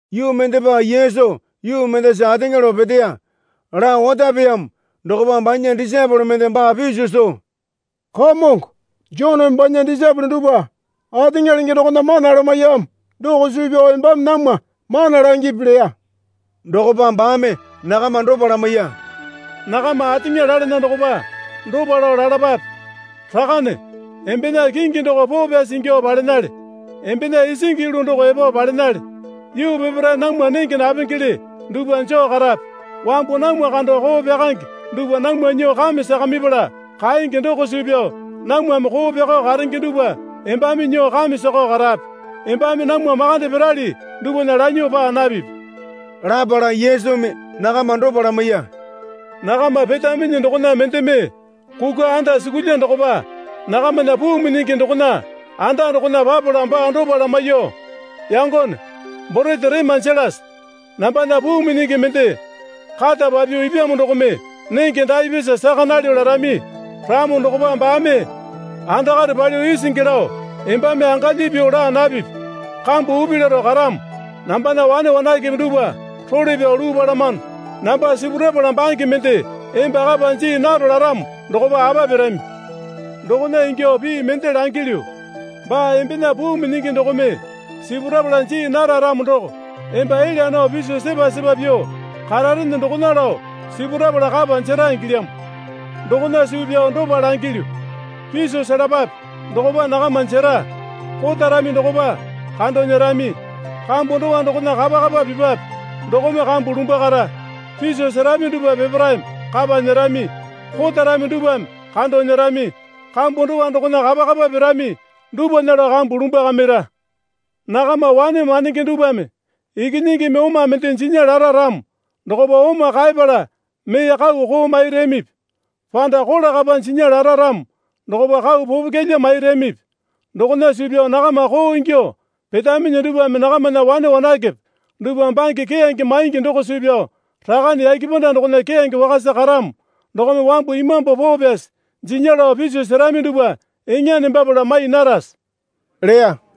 Yuu mendepa Yesu yuu mendasa ateŋa lao peteya. Lao otapeyamo dokopa banya disaepole mende baa piso soo, Kamongo Joneme banya disaepole dupwa ateŋa lenge dokona mana lamaiyamo doko suu pyao embame namwa mana langipi leya. Dokopa baame nakama dopa lamaiya. Nakama ateŋa lalana dokopa dopa lao lalapape. Rakane, embena kingi doko poo pyasi ingyuo palenale. Embena isingi yulu doko epo palenale. Yuu peparae namwa nenge napengele dupwa joo karape. Wambu namwa kando koo pyakange dupwa namwa nyuo kame sakamipala kaenge doko suu pyao namwame koo pyakao karenge dupwa embame nyuo kame sakao karape. Embame namwa makande pirali dupwana lanyuo paa napipi. Lapala Yesumi nakama dopa lamaiya. Nakama petaminyi dokona mendeme kukwa andasukulya dokopa nakamana puu minyingi dokona anda dokona papala baa dopa lamamiyuo, Yangone, borete rema jelase. Nambana puu minyingi mende kata papyuo ipyamo dokome nenge daapyasa saka nalyo larami ramo dokopa baame andakare palyuo isingi lao, Embame angalyi pyuo laa napipi. Kambu upi laro karamo. Nambana wane wanakepe dupwa role pyao luu palamano. Namba sipurapala bange mende emba kapa jii naro laramo dokopa apa pirami? Dokona ingyuo pii mende langilyu, Baa embena puu minyingi dokome sipurapala jii nara ramo doko emba elya nao piso sepa sepa pyuo kararene dokona lao sipurapala kapa jera ingilyamo. Dokona suu pyao dopa langilyu, Piso selapape. Dokopa nakama jera. Kotarami dokopa kando nyerami. Kambu dowa dokona kapa kapa pipwape. Dokome kambu lumbwakara. Piso serami dupwa peparaeme kapa nyerami. Kotarami dupwame kando nyerami. Kambu dowa dokona kapa kapa pirami dupwana lao kambu lumbwakamira. Nakama wane mandenge dupwame ikinyingimi oma mende jinya lara ramo dokopa oma kaepala mee kau koo mairamipi? Panda kola kapa jinya lara ramo dokopa kau popokyalya mairamipi? Dokona suu pyao nakama koo ingyuo petaminyi dupwame nakamana wane wanakepe dupwa bange keyange maingi doko suu pyao Rakane yake panda dokona keyange wakasa karamo dokome wambu Imambu Poo Pyasi jinya lao piso serami dupwa eŋa nembapala mai narase? leya.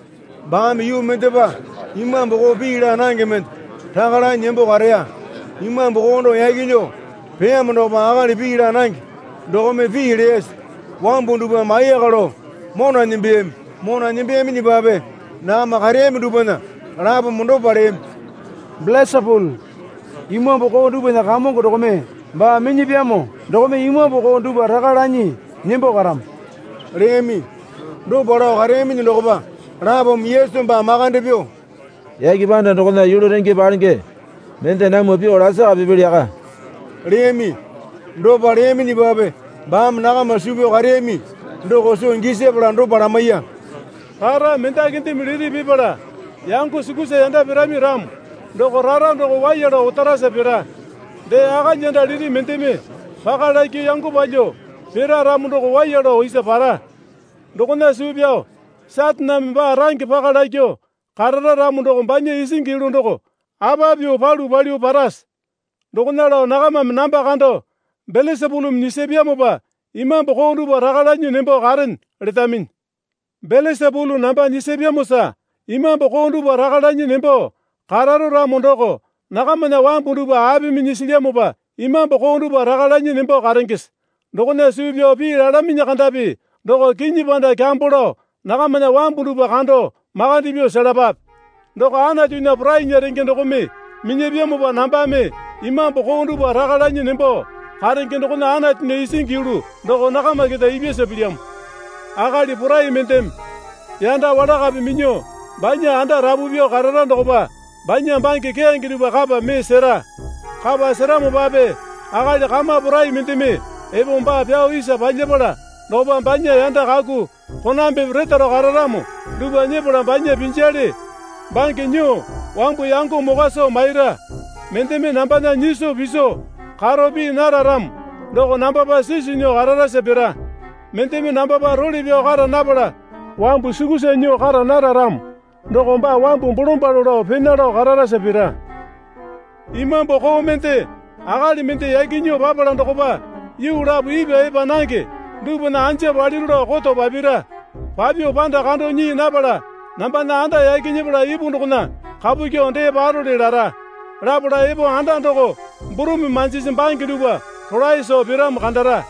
Baame yuu mendepa imambu koo pii laa nange mende raka lanyi nembo kareya. Imambu koo doko yaki nyuo peyamo dokopa akali pii laa nange dokome pii leyasa wambu dupwame ayaka lao mona nembeyami. Mona nembeyaminyipape nakama kareyami dupwana lapome dopa leyami. Belesapulu imambu koo dupwana kamongo dokome baa minyapyamo dokome imambu koo dupwa raka lanyi nembo karamo leyami. Dopa lao kareyaminyi dokopa lapome Yesu baa makande pyuo, Yake panda dokona yulu renge palenge mende namwa pyuo lasaka pipili yaka leyami. Dopa leyaminyipape baame nakama suu pyao kareyami doko soo gisapala dopa lamaiya. Rara mendakindeme liti pipala yango sukusa yanda pirami ramo doko rara doko waiya lao otarasa pira. Dee akalyanda liti mendeme paka lakyuo yango palyuo pira ramo doko waiya lao isa para. Dokona suu pyao Sataneme baa range paka lakyuo karara ramo doko banya isingi yulu doko apa pyuo palu palyuo parase? Dokona lao nakamame namba kando, Belesapulumi nyisapyamopa imambu koo dupwa raka lanyi nembo karene, letaminyi. Belesapulu namba nyisapyamosa imambu koo dupwa raka lanyi nembo kararo ramo doko nakamana wambu dupwa apimi nyisilyamopa imambu koo dupwa raka lanyi nembo karengese? Dokona suu pyao pii lalaminyi kandapi doko kinyi panda kyambo lao nakamana wambu dupwa kando makande pyuo selapape. Doko Anatunya porainya renge dokome minyapyamopa nambame imambu koo dupwa raka lanyi nembo karenge dokona Anatunya isingi yulu doko nakama keta ipyasa pilyamo. Akali porai mendeme yanda walakape minyuo banya anda rapu pyuo karara dokopa banya bange keyange dupwa kapa mee sera. Kapa seramopape akali kama porai mendeme epo baa pyao isa palyapala dokopa banya yanda kaku konambepe retaro kararamo dupwa nyepala banya pinjale bange nyuo wambu yango mokwa soo maira. Mendeme nambana nyiso piso karo pii nara ramo doko nambapa sisu nyuo kararasa pira. Mendeme nambapa role pyao kara napala wambu sukusa nyuo kara nara ramo doko baa wambu bolombalo lao pena lao kararasa pira. Imambu koo mende akali mende yaki nyuo papala dokopa yuu lapo ipwa epa nange dupwana anja paliru lao koto papira. Papyuo panda kando nyii napala, Nambana anda yaki nyepala ipu dokona kapu kyuo dee parole lara. Lapala epo anda doko burumi manjisi bange dupwa rolae soo piramo kandara.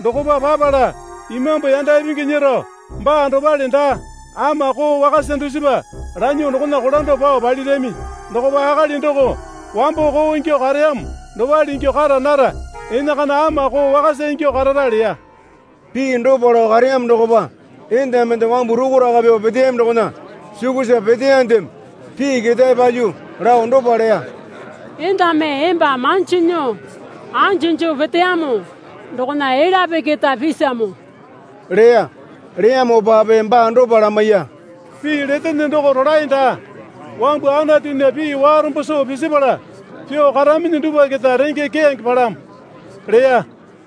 Dokopa papala imambu yanda ipingi nyero baa dopale daa, ama koo wakasa dusipa lanyuo dokona kolando pao palirami. Dokopa akali doko wambo koo ingyuo kareyamo dopale ingyuo kara nara, enakana ama koo wakasa ingyuo karara leya. Pii dopa lao kareyamo dokopa enda mende wambu rukuraka pyuo peteyami dokona sukusa peteyandeme pii ketae palyuo lao dopa leya. Endame emba manjo nyuo anju joo peteyamo dokona elyape keta pisamo leya. Leyamopape baa dopa lamaiya. Pii letene doko rolae daa. Wambu Anatunya pii warombo soo pisipala pyuo karaminyi dupwa keta renge keyange palamo leya.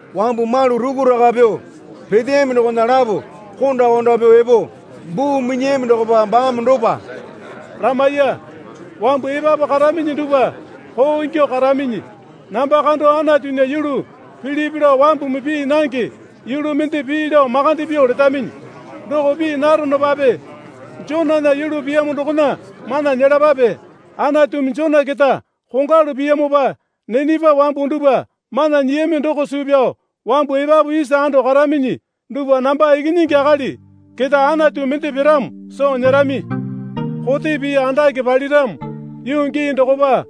Wambu malu rukuraka pyuo peteyami dokona lapo kondo konda pyuo epo buu minyiyami dokopa baame dopa lamaiya. Wambu epapu karaminyi dupwa koo ingyuo karaminyi. Namba kando Anatunya yulu pilipi lao wambumi pii nange yulu mende pii lao makande pyuo letaminyi. Doko pii naronopape Jonana yulu piyamo dokona mana nyelapape. Anatumi Jona keta kongwalu piyamopa Ninepa wambu dupwa mana nyiyami doko suu pyao wambu epapu isa ando karaminyi dupwa namba Ikinyingi Akali keta Anatu mende piramo soo nyerami. Kote pii andake paliramo yuu gii dokopa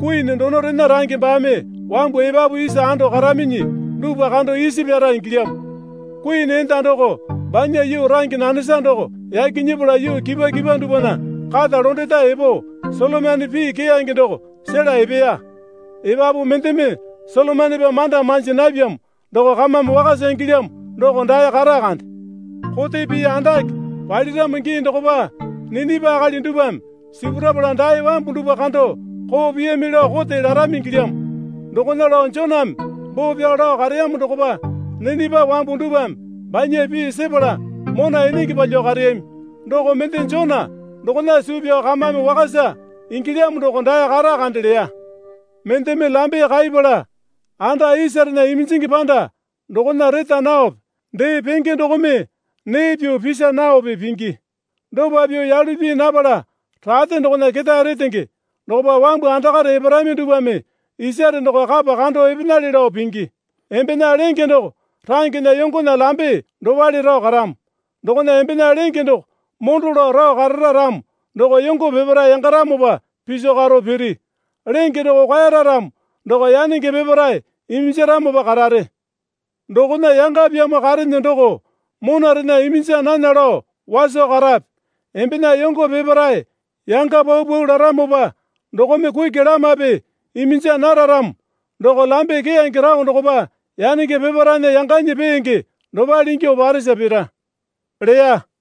Kuini donorena range baame wambu epapu isa ando karaminyi dupwa kando isipyara ingilyamo. Kuini enda doko banya yuu range nanesa doko yaki nyepala yuu kipwa kipwa dupwana kata londeta epo Solomena pii keyange doko sela epeya. Epapu mendeme Solomonepa manda manji napyamo doko kamame wakasa ingilyamo doko dae kata kande. Kote pii andake paliramo gii dokopa Ninepa akali dupwame sipurapala dae wambu dupwa kando koo piyami lao kote larami ingilyamo. Dokona lao Joname boo pyao lao kareyamo dokopa Ninepa wambu dupwame banya pii sepala mona enenge palyuo kareyami. Doko mende Jona dokona suu pyao kamame wakasa ingilyamo doko dae kata kande leya. Mendeme lambe kaipala anda isarena iminjingi panda dokona reta naope dee penge dokome nee pyuo pisa naope pingi. Dopa pyuo yalu pii napala rate dokona ketae retenge dokopa wambu andakare eparami dupwame isare doko kapa kando epenale lao pingi. Embena lenge doko rangena yongona lambe dopale rao karamo. Dokona embena lenge doko mondo lao rao karara ramo doko yongo peparae yangaramopa piso karo piri. Lenge doko kwaeyara ramo doko yanenge peparae iminjaramopa karare. Dokona yangapyamo karene doko monarena iminja nana lao waso karape. Embena yongo peparae yanga paupau laramopa dokome kuki lamape iminja nara ramo doko lambe keyange rao dokopa yanenge peparaena yanganyi peenge dopale ingyuo paresa pira leya.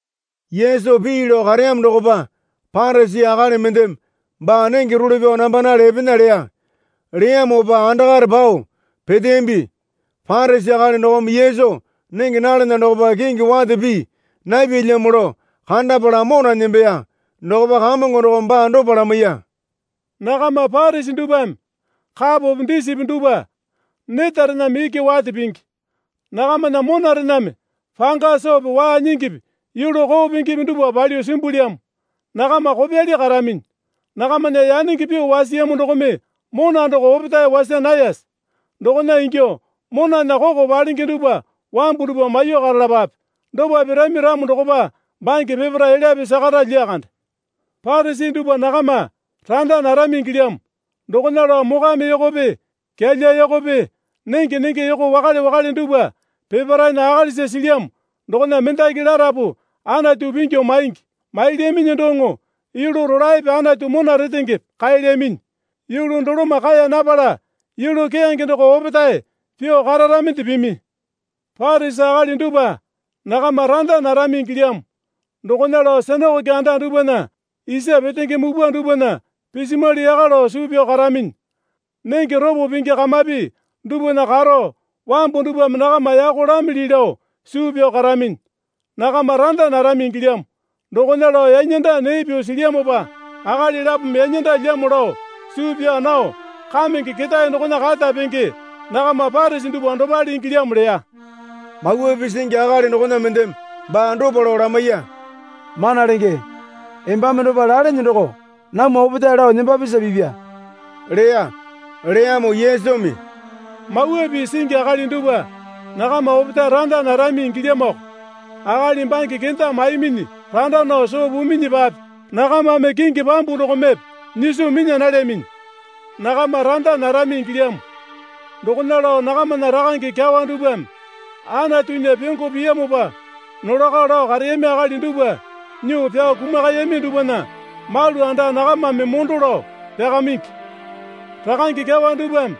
Yesu pii lao kareyamo dokopa Parisi akali mendeme baa nenge role pyao nambanale epena leya. Leyamopa andakare pao peteyambi. Parisi akali dokome Yesu nenge nalana dokopa kingi wate pii napyalyamo lao kandapala mona nembeya. Dokopa Kamongo dokome baa dopa lamaiya. Nakama Parisi dupwame kapope disipi dupwa netarename iki wate pingi. Nakamana monarename panga soope waa nyingipi yulu koo pingipi dupwa palyuo simbulyamo. Nakama kopyali karaminyi. Nakamana yanenge pyuo wasiyamo dokome mona doko opetae wasa nayase? Dokona ingyuo monana koko palenge dupwa wambu dupwa maiyuo karalapape. Dopa pirami ramo dokopa bange peparae elyape sakara lyakande. Parisi dupwa nakama randa narami ingilyamo. Dokona lao mokwame yokope kyalya yokope nenge nenge yoko wakale wakale dupwa peparaena akalisa silyamo dokona mendaki larapu Anatu pingyu maingi. Mailyaminyi doŋo yulu rolaepe Anatu mona retengepe kaelyaminyi. Yulu doloma kae napala yulu keyange doko opetae pyuo kararaminde pimi. Parisi akali dupwa nakama randa narami ingilyamo. Dokona lao sinakoke anda dupwana isa petenge mupwa dupwana pisimwali yaka lao suu pyao karaminyi. Nenge ropo pingi kamapi dupwana karo wambu dupwame nakama yako lamili lao suu pyao karaminyi. Nakama randa narami ingilyamo. Dokona lao yanyanda nee pyuo silyamopa akali lapome yanyandalyamo lao suu pyao nao kamenge ketae dokona kata penge nakama Parisi dupwa dopale ingilyamo leya. Mawa Pii singi akali dokona mendeme baa dopa lao lamaiya. Mana Lenge, embame dopa lalene doko namwa opetae lao nembapisa pipya leya. Leyamo Yesumi, Mawa Pii singi akali dupwa nakama opetae randa narami ingilyamoko. Akali bange kenda maiminyi randa nao soo puminyipape nakamame kingi pambu dokomepe nyiso minya nalyaminyi. Nakama randa narami ingilyamo. Dokona lao nakamana rakange kyawa dupwame Anatunya pyongo piyamopa nolako lao kareyami akali dupwa nyuo pyao kumakayami dupwana malu anda nakamame mondo lao pyakamingi. Rakange kyawa dupwame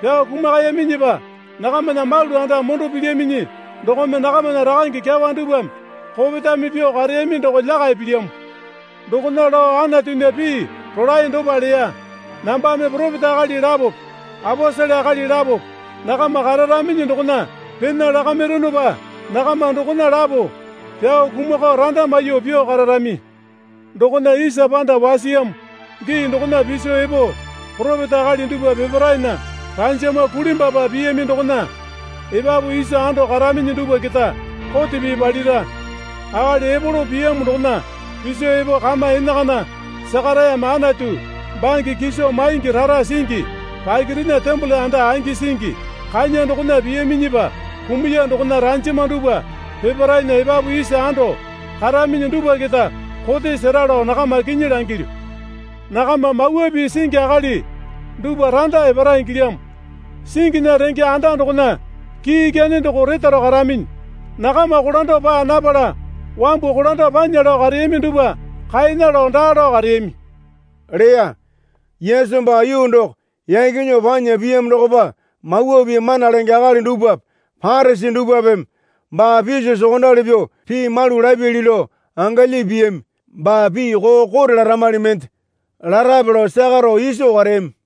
pyao kumakayaminyipa nakamana malu anda mondo pilyaminyi dokome nakamana rakange kyawa dupwame kopetame pyuo kareyami doko lyakai pilyamo. Dokona lao Anatunya pii rolae dopa leya. Nambame poropeta akali lapope aposele akali lapope nakama kararaminyi dokona pena lakamironopa nakama dokona lapo pyao kumakao randa maiyuo pyuo kararami. Dokona isa panda wasiyamo gii dokona piso epo poropeta akali dupwa peparaena ranjama kulimbwapa piyami dokona epapu isa ando karaminyi dupwa keta kote pii palira. Akali Epolo piyamo dokona piso epo kama enakana Sakarayame Anatu bange kiso maingi rara singi pakirena tembole anda angi singi kanya dokona piyaminyipa kumuya dokona ranjama dupwa peparaena epapu isa ando karaminyi dupwa keta kote sera lao nakama kinyi langilyu. Nakama Mawa Pii singi akali dupwa randa epara ingilyamo. Singinya renge anda dokona kii ikyane doko retaro karaminyi. Nakama kolando paa napala wambu kolando panya lao kareyami dupwa kaena lao daa lao kareyami, leya. Yesu baa yuu doko yaki nyuo panya piyamo dokopa Mawa Pii mana lenge akali dupwape Parisi dupwapeme baa piso sokondali pyuo pii malu lapyali lao angalye piyami. Baa pii koo kote laramali mende larape lao lyakaro iso kareyami.